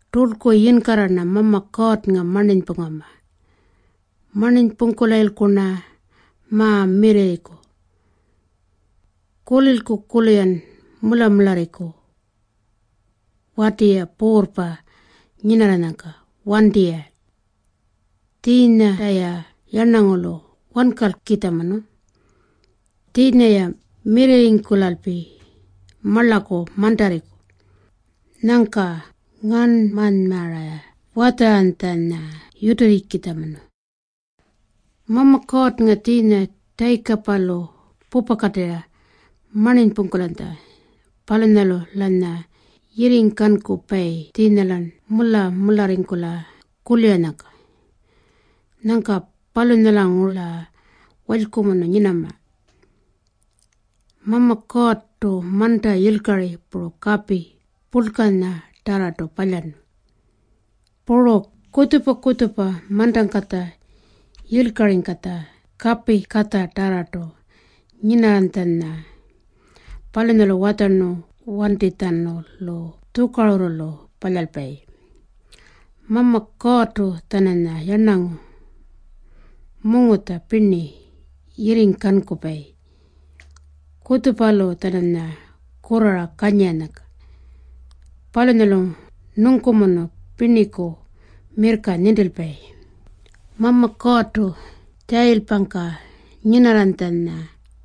Turlku yinkarra-rna Mama Kuurrnga marninypungama. Marninypungkulayilku-rna ma-mirrirriku. Kulilku-kurlu-yan mula-mularriku wati-ya puurrpa nyinarranyangka. Wanti-ya. Tjiinyanta-ya yarnangulu wankalkitjamunu. Tjiinya-ya mirrirringkulalpi marlaku mantarriku. Nyangka ngarnmanymara-ya watjaranytjanya yutirrikitjamunu. Mama Kuurrnga tjiinya Tjayikapalu pupakatirra marninypungkulanytja, palunyalu-lanya yirringkankupayi tjiinya-lan mula-mularringkula kuliranyangka. Nyangka palunyalanguru-la walykumunu nyinama. Mama Kuurrtu manta yilkari puru kapi purlkanyatarrartu palyarnu, puru kutjupa-kutjupa mantangkatja yilkaringkatja kapingkatjatarrartu nyinarranytjanya. Palunyalu watjarnu wantitjatjanulu tjukarurrulu palyalpayi. Mama Kuurrtu-tjananya yarnangu mungutja pirni yirringkankupayi kutjupalu-tjananya kurrara kanyiranyangka. Palunyalu nungkumunu pirniku mirrka nintilpayi. Mama Kuurrtu tjayilpangka nyinarranytjanya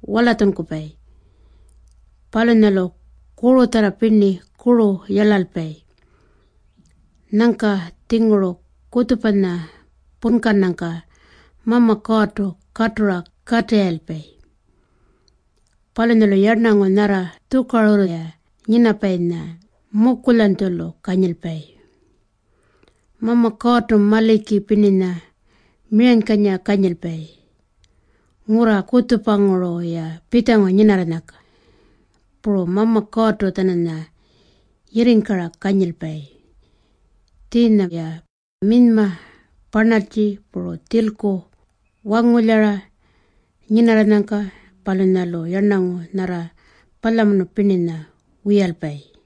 walatjunkupayi. Palunyalu kurutjarra pirninya kuru yarlalpayi. Nyangka-tjinguru kutjupanya punkannyangka Mama Kuurrtu katura katirrayilpayi. Palunyalu yarnangu nyarra tjukarurru-ya nyinapayinya mukulyanytjulu kanyilpayi. Mama Kuurrtu maliki pirninya miranykanyira kanyilpayi ngurra kutjupanguru-ya pitjangu nyinarranyangka. Puru Mama Kuurrtu-tjananya yirringkara kanyilpayi tjiinya-ya minyma parnaltji puru tjilku wangulyara nyinarranyangka. Palunyalu yarnangu nyarra palyamunu pirninya wiyalpayi.